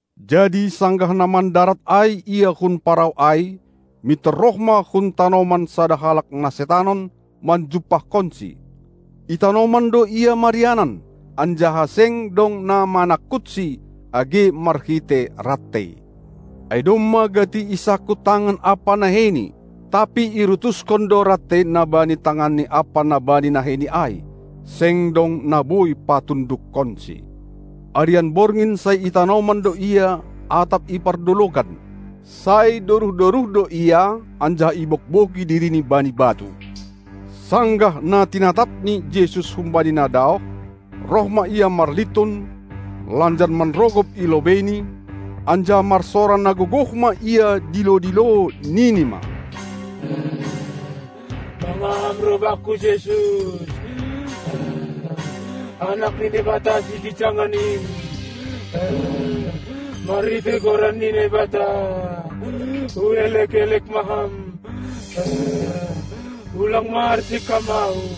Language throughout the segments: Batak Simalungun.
Jadi sanggah na mandarat ai Ia hun parau ai, mintor roh ma hun tanoman sada halak na setanon manjumpahkonSi. I tanoman do ia marianan, anjaha seng dong na manangkutsi, age marhitei rantei. Ai domma gati isangkut tangan ampa naheini, tapi irutuskon do rantei na bani tanganni ampa na bani naheini ai, seng dong na boi patundukkonsi. Arian borngin sai i tanoman do ia atap i pardologan; sai doruh-doruh do ia, anjaha ibogbogi dirini bani batu. Sanggah na tinatapni Jesus humbani na daoh, roh ma ia marlintun, lanjar manrogop i lobeini, anjaha marsora na gogoh ma ia dilo-dilo, nini ma: Mangaha Ham roh bakku, Jesus, Anak ni Naibata, Sigijangan in? Marhitei goran ni Naibata, huelek-elek ma Ham, ulang ma arsik Ham ahu!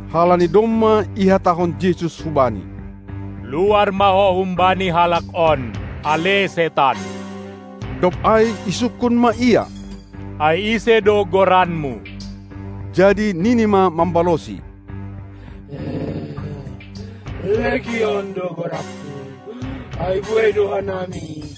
Halani domma ihatahon Jesus hubani: Luar ma ho humbani halak on, ale setan! Dob ai isungkun ma ia: Ai ise do goranmu? Jadi nini ma mambalosi: Legion do goranku, ai buei do hanami.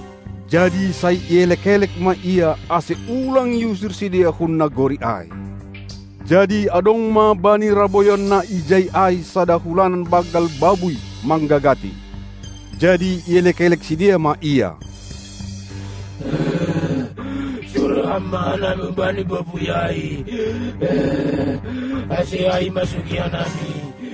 Jadi sai ielek-elek ma Ia, ase ulang iusir sidea hun nagori ai. Jadi adong ma bani raboyon na ijai ai sada hulanan banggal babuy, manggagati. Jadi ielek-elek sidea ma Ia; Suruh Ham ma hanami hubani babuy ai, ase ai imasuki hanami.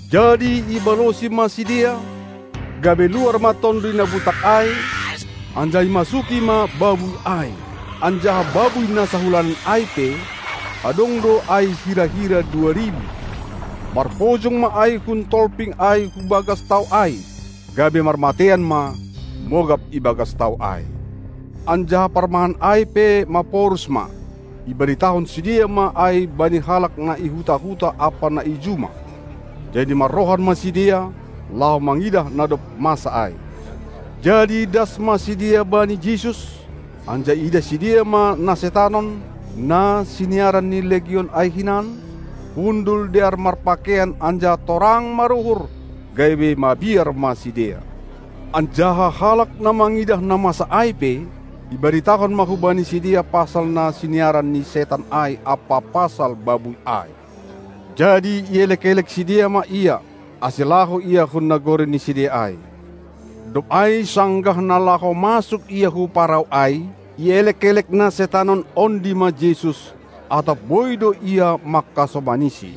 Jadi ibalosi ma sidea, gabe luar ma tonduy na butak ai, anjaha imasuki ma babuy ai. Anjaha babuy na sahulanan ai pe, adong do ai hira-hira dua ribu; marpojong ma ai hun tolping ai hu bagas tao ai, gabe marmateian ma, mogap i bagas tao ai. Anjaha parmahan ai pe maporus ma; ibaritahon sidea ma ai bani halak na i huta-huta ampa na i juma. Jadi marrohan ma sidea, laho mangidah na dob masa ai. Jadi das ma sidea bani Jesus, anjaha iidah sidea ma na setanon, na siniaran ni Legion ai hinan, hundul dear marpakeian anjaha torang maruhur, gabe mabiar ma sidea. Anjaha halak na mangidah na masa ai pe, ibaritahon ma hubani sidea pasal na siniaran ni setan ai ampa pasal babuy ai. Jadi ielek-elek sidea ma Ia, ase laho Ia hun nagori ni sidea ai. Dob ai sanggah na laho masuk Ia hu parau ai, ielek-elek na setanon ondi ma Jesus, atap boi do ia mangkasomaniSi.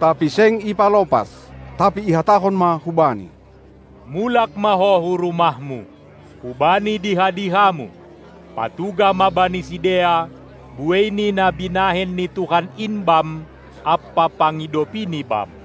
Tapi seng ipalopas, tapi ihatahon ma hubani: Mulak ma ho hu rumahmu, hubani diha-dihamu! Patugah ma bani sidea, buei ni nabinahen ni Tuhan in bam, ampa pangidopiNi bam.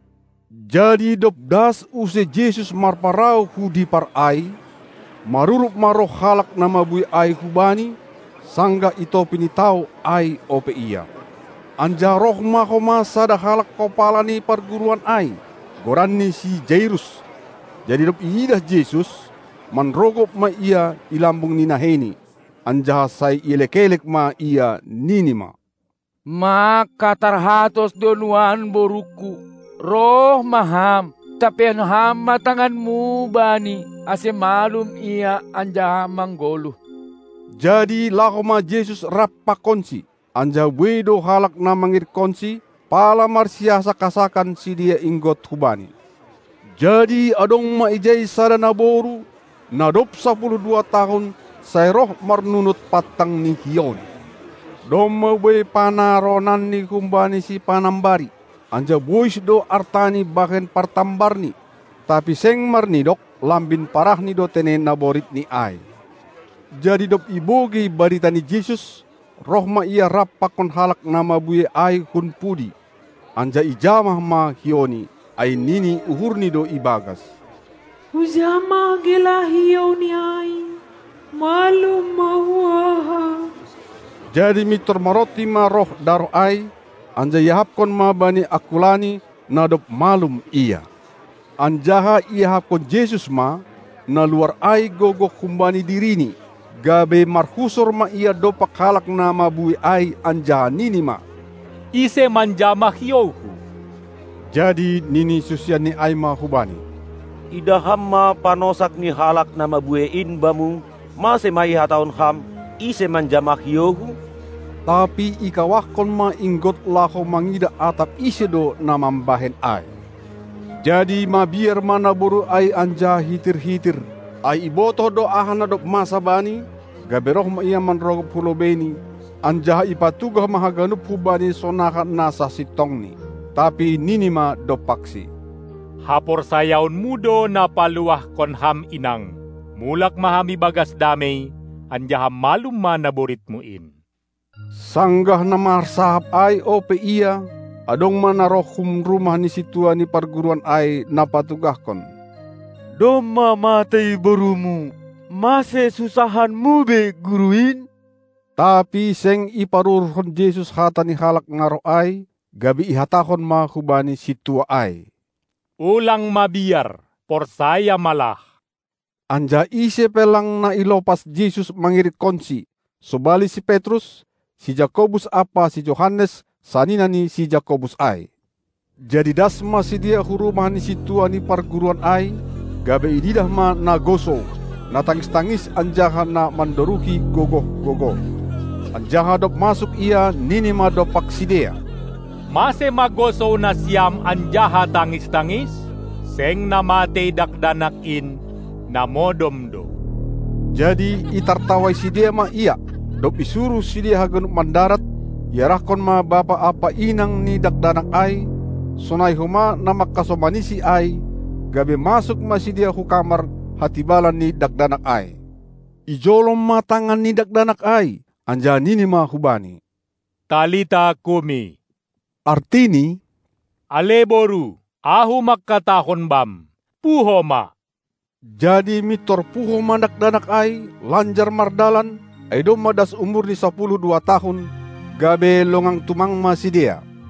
Jadi dob das use Jesus marparau hu dipar ai, marurup ma roh halak na mabuei ai hu Bani, sanggah i topi ni tao ai ope Ia. Anjaha roh ma homa sada halak kopala ni parguruan ai, goranni si Jairus; jadi dob iidah Jesus, manrogop ma ia i lambung ni naheiNi, anjaha sai ielek-elek ma Ia, nini ma: Mangkatarhatos do nuan borungku. Roh ma Ham, tampeihon Ham ma tanganMu bani, ase malum ia anjaha manggoluh. Jadi laho ma Jesus rap pakonsi, anjaha buei do halak na mangirikkonSi, pala marsiasak-asakan sidea inggot hu Bani. Jadi adong ma ijai sada naboru, na dob sapuluh dua tahun sai roh marnunut pantang ni hiouni. Domma buei panaronanni humbani sipanambari, anjaha bois do artani bahen partambarni, tapi seng marnidok, lambin parahni do tene naboritni ai. Jadi dob ibogei barita ni Jesus, roh ma ia rap pakon halak na mabuei ai hun pudi, anjaha ijamah ma hiouNi, ai nini uhurni do i bagas: Hujamah gelah hiouNi ai, malum ma huahap. Jadi mintor maronti ma roh daroh ai, anjaha iahapkon ma bani angkulani, na dob malum ia. Anjaha iahapkon Jesus ma, na luar ai gogoh humbani diriNi, gabe marhusor ma Ia dompak halak na mabuei ai anjaha nini ma: Ise manjamah hiouHu? Jadi nini susianNi ai ma hu Bani: Idah Ham ma panosak ni halak na mabuei in Bamu, mase ma ihatahon Ham: Ise manjamah hiouHu? Tapi ikawahkon ma inggot laho mangidah atap ise do na mambahen ai. Jadi mabiar ma naboru ai anjaha hitir-hitir, ai ibotoh do aha na dob masa bani, gabe roh ma ia manrogop hu lobeiNi, anjaha ipatugah ma haganup hu Bani sonaha na sasintongni. Tapi nini ma dompakSi: Haporsayaonmu do na paluahkon ham, inang! Mulak ma ham ibagas damei, anjaha malum ma naboritmu in! Sanggah na marsahap ai ope ia, adong ma na roh hun rumah ni sintua ni parguruan ai na patugahkon: Domma matei borumu! Mase sunsahanmu be Guru in? Tapi seng iparuhurhon Jesus hata ni halak na roh ai, gabe ihatahon ma hubani sintua ai: Ulang mabiar! Porsaya ma lah! Anjaha ise pe lang na ilopas Jesus mangirikkonSi, sobali si Petrus, si Jakobus ampa si Johannes, sanina ni si Jakobus ai. Jadi das ma sidea hu rumah ni sintua ni parguruan ai, gabe iidah ma na gosou, na tangis-tangis anjaha na mandoruhi gogoh-gogoh. Anjaha dob masuk Ia, nini ma dompak sidea: Mase ma gosou nasiam anjaha tangis-tangis? Seng na matei dakdanak in, na modom do! Jadi itartawai sidea ma Ia. Dob isuruh sidea haganup mandarat, iarahkon ma bapa ampa inang ni dakdanak ai, sonai homa na mangkasomanisi ai, gabe masuk ma sidea hu kamar hatibalan ni dakdanak ai. Ijolom ma tangan ni dakdanak ai, anjaha nini ma hubani: Talita kumi! artini: Ale Boru, Ahu mangkatahon bam, puho ma! Jadi mintor puho ma dakdanak ai, lanjar mardalan, ai domma das umurni sapuluh dua tahun, gabe longang tumang ma sidea.